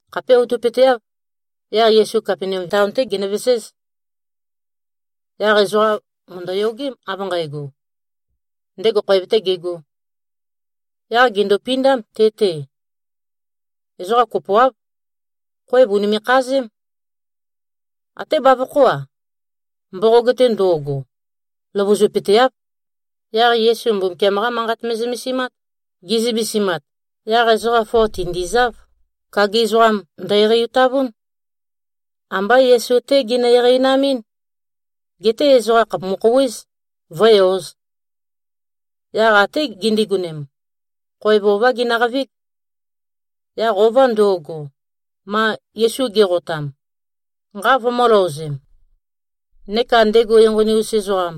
Khapé outøpøteáv. Yaq Yesu Kapenaum taon-té genøveséz. Yaq ezoqa mø̀ndøyogém, av nqægo, ndego khoev-tē gegō. Yaq gèndopindám te-te. Ezoqa kopoáv. Khoev ùnime꞉-khazém. Até bavokhó-a, mboqog-te ndo꞉go, løvøzupøteáv. Yaq Yesu Mbumbukiam-qá Manqat me꞉zømesimát. Ge꞉zømesimat, yaq ezoqa foa tìndizáv. Kagi ezoqam ndø-eqeitavún. Ambá Yesu-té ginø-eqeinamɨ́n. Geté ezoqa khàpumu-khouwéz, vǿe-ōz. Yaq até gindigonem, khoev ová ginøqavíg, yaq ova ndo꞉go, ma Yesu ge꞉qotam, nqa vømø̄-løozem, neka ndego enqoni-us ezoqam,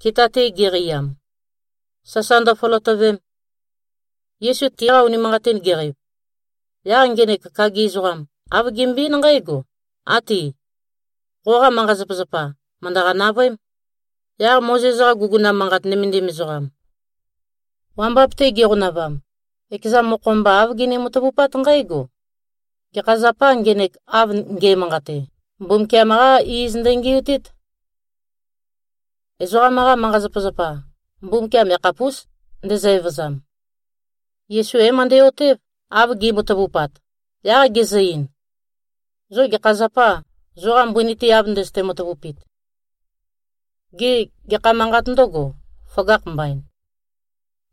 kita-te geqeiam, sasa ndøføløtøvem. Yesu tiqa unimanqatin geqeiv, yaq ngenek kagi ezoqam, āv gembøe-eín nqǽgo, “Áti. Qoqa manqa-zapazapa mø̀ndøqa-navøém.” Yaq Mozes-qa guguna manqat nømendim ezoqam, wambap-te giqonavam, ekeza mokho-mba āv gini-matavupát nqǽgo, “Gekha zapâ, ngenek av nge꞉manqate? Mbumbukiam-qá iz ndøngi꞉tít. Ezoqam-qa manqa-zapazapa, Mbumbukiam yakhapús, ndezø-evøzam.” Yesu é-møndæ-otév, av gi꞉matavupat. Yaq gezø-ein, “Zo gekha zapâ, zoqa mbøni-te av ndøzøte-matavupit? Gê, gekha manqât ndøgo, føgakh mbain?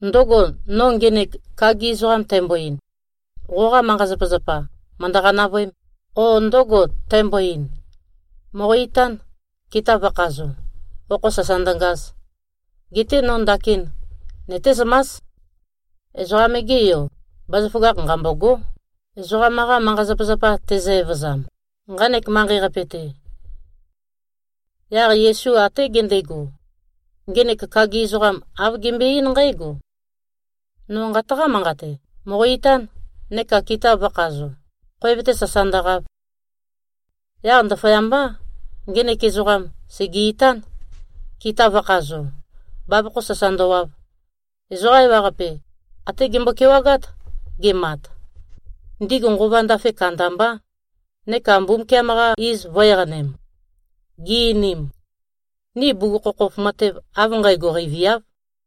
Ndǿgò, no ngenek kagi ezoqam tæmbo-ein, ‘Qoqa manqa-zapazapa mø̀ndøqa-navøēm,’ o ndǿgò, tæmbo-ein, ‘Mòqo-itán, kita vø̄khazo, okho sasa ndøngaz?’ Geté no ndakin nøtézømás, Ezoqam-ge Yo, bazaføgakh nqambôgó, ezoqam-qa manqa-zapazapa tezø-evøzam, nqanek manqei-qape-te.” Yaq Yesu até gendego, ngenek kagi ezoqam āv gembøe-eín nqǽgo, “No nqataqá-manqate. Mòqo-itán, neka kita vø̄khazo, khoev-te sasa ndøqav.” Yaq ndaføyambá, ngenek ezoqam sège-itán, kita vø̄khazo, bavokho sasa ndøwav. Ezoqa ewaqape até gembo-kewagát, gemat. Ndigu nqova ndafe kandambá, neka Mbumbukiam-qa iz vø̄-eqanem. Gi-einim, “Ni bugukhokhof matev av nqægo qeiviáv.”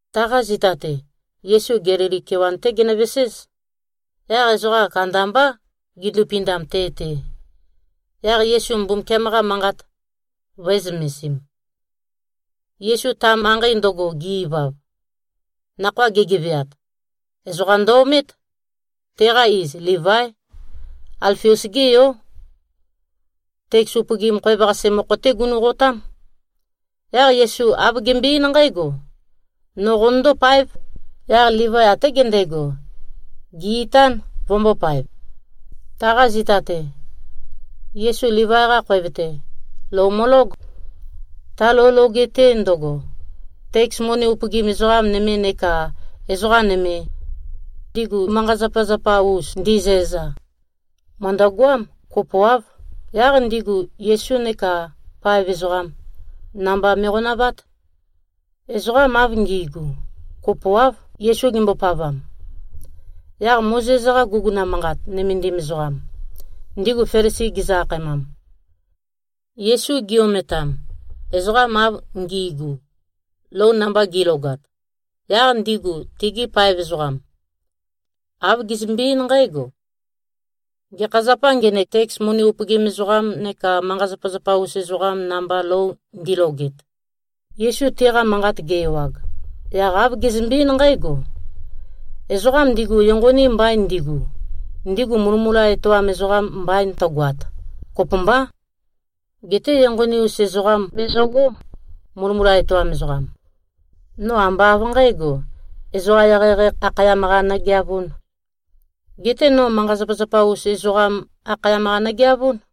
Taqa zita-te, Yesu Gelili kewan-té genøveséz. Yaq ezoqa kandambá, gindupindam te-te. Yaq Yesu Mbumbukiam-qa Manqat vø̄e-zømesim. Yesu ta manqei ndøgo ge-ivav, nakhoa gegeveat, ezoqam ndø-omét. Teqa iz Livái. Alfius-gé yó. Teks upøgim khoev-qase mokho-té gunu꞉qotám. Yaq Yesu āv gembøe-eín nqǽgo, “No qonøndó-páev.” Yaq Livai até gendego, gè-itán, vømbōpaev. Taqa zita-te, Yesu Livai-qa khoev-te, lou mølóg. Ta lou loge-te ndøgo, teks moni upøgim ezoqa nøme neka ezoqa nøme, ndigu manqa-zapazapa-us ndizæza, mø̀ndøgoám. Kopoáv. Yaq ndigu Yesu neka paev ezoqam, namba me꞉qonavát. Ezoqam av ngi꞉gu, kopoáv, Yesu gimbopavam. Yaq Mozes-qa guguna manqat nømendim ezoqam, ndigu Felisi gizø-akhaemam, Yesu gi-ometam, ezoqam av ngi꞉gu, lou namba gi꞉logat, yaq ndigu tegi paev ezoqam, āv gezømbe-eín nqǽgo, “Gekha zapâ, ngenek teks moni upøgim ezoqam neka manqa-zapazapa-us ezoqam namba lou ndiloget?” Yesu tiqa manqat ge-ewag, yaq āv gezømbe-eín nqǽgo, “Ezoqam ndigu enqoni mbain ndigu, ndigu mulømula etoam ezoqam mbain tøgoat, kopømbá. Geté enqoni-us ezoqam bezøgó, mulømula etoam ezoqam. No ambá av nqǣgo, ezoqa eqeieqei akhayam-qa nøgeavūn. Geté no manqa-zapazapa-us ezoqam akhayam-qa nøgeavún.”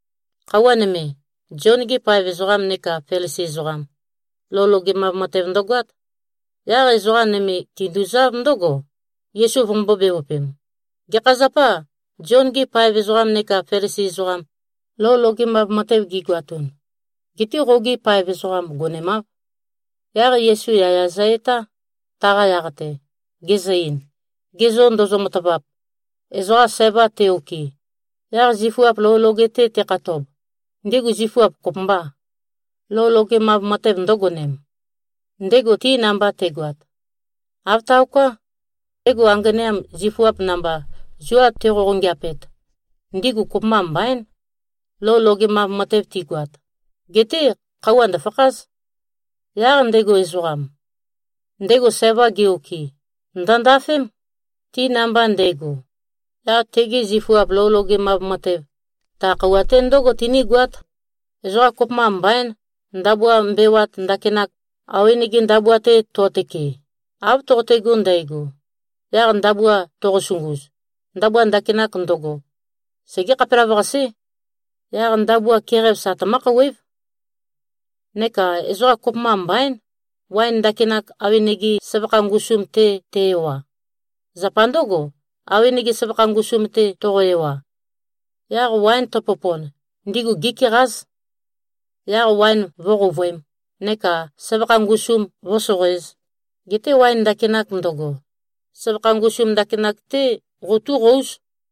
Khøuwa nøme, Zion-gi paev ezoqam neka Felisi ezoqam, lou logemav matev ndøgoát. Yaq ezoqa nøme tinduzáv ndǿgo, Yesu vømbō-bevøpem, “Gekha zapâ, Zion-gi paev ezoqam neka Felisi ezoqam, lou logemav matev gigoatun, getē qogi paev ezoqam gonemāv?” Yaq Yesu yaya zø-etá, taqa yaq-te, gezø-ein, “Ge zô ndozo-matavap, ezoqa sæva te-okɨ, yaq zifuap lou loge-te tekhatob, ndigu zifuap kopømbâ, lou logemav matev ndø̄gonem, ndego ti namba te꞉goat? Āv taoká. Ndego anganeam, zifuap namba zua tiqoqongeapet, ndigu kopømba mbaín, lou logemav matev tigoat. Geté khøuwa ndø̀fakház. Yaq ndego ezoqam, ndego sævam ge-okɨ, ndø̀ndafém, ti namba nde꞉go. Yaq tegi zifuap lou logemav matev, ta khøuwa-te ndǿgo tinígoát. Ezoqa kopømba mbaín, ndabua mbewat ndakinak, awenege ndabua-te to꞉tøke. Av toqotego ndægo, yaq ndabua toqosunguz, ndabua ndakinak ndøgo, segé-khapelavøqasé. Yaq ndabua keqæv sa tømǿ-khouwév. Neka ezoqa kopømba mbaín, waen ndakinak, awenege søvakha ngusum-te te-ewa. Zapa ndǿgo, awenege søvakha ngusum-te toqo-ewa, yaq waen tøpopon, ndigu gékeqáz. Yaq waen vǿqouvøēm, neka søvakha ngusum vǿsoqoēz. Geté waen ndakinak ndøgo, søvakha ngusum ndakinak-té qotúqóuz.”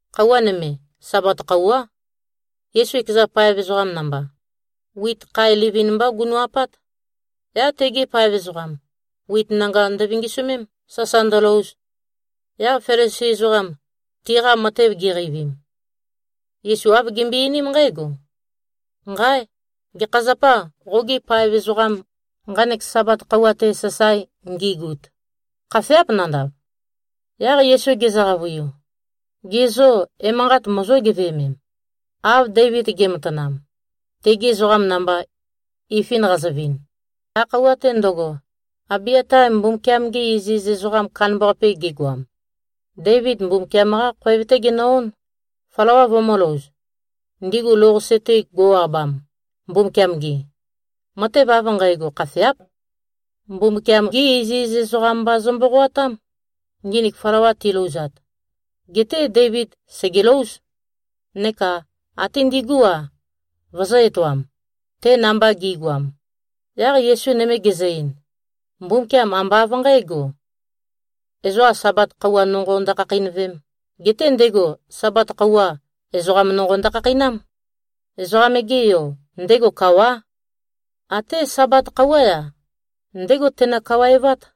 Khøuwa nøme, Sabat khøuwá, Yesu ekeza paev ezoqam namba, wit khae livin-mbá gunu꞉-apát. Yaq tegi paev ezoqam, wit nanga ndøvingisømém, sasa ndølouz. Yaq Felisi ezoqam tiqa matev giqeivim, Yesu āv gimbøe-einím nqǽgo, “Nqáe! Gekha zapâ, qogi paev ezoqam nqanek Sabat khøuwa-te sasae ngigut. Khafeáp nandav?” Yaq Yesu gezø-qavøiu, “Ge zô, emanqat mozó-geveømem, av Deivid ge꞉matanam, tegi ezoqam namba ifin qazøvin? Ta khøuwa-te ndøgo, Abiata Mbumbukiam-ge iziz ezoqam kandambaqape gegoam, Deivid Mbumbukiam-qá khoev-té genø-ón, flawa vømø̄louz, ndigu lou-qase-te go꞉-abam, Mbumbukiam-gi. Matev av nqægo khafeáp. Mbumbukiam-gí iziz ezoqam mba zø-mboqoatám, nginik flawa tilouzat. Geté Deivid sègelóuz, neka até ndigú-a, vøzø̄-etoam, te namba gi꞉goam.” Yaq Yesu nøme gezø-ein, “Mbumbukiam ambá av nqǣgo, ezoqa Sabat khøuwa nonqo ndøkhakheinøvēm. Geté ndego Sabat khøuwa, ezoqam nonqo ndøkhakheinám. Ezoqam-ge Yo, ndego kawá. Até Sabat khøuwá-ya, ndégo teno-kawaevát.”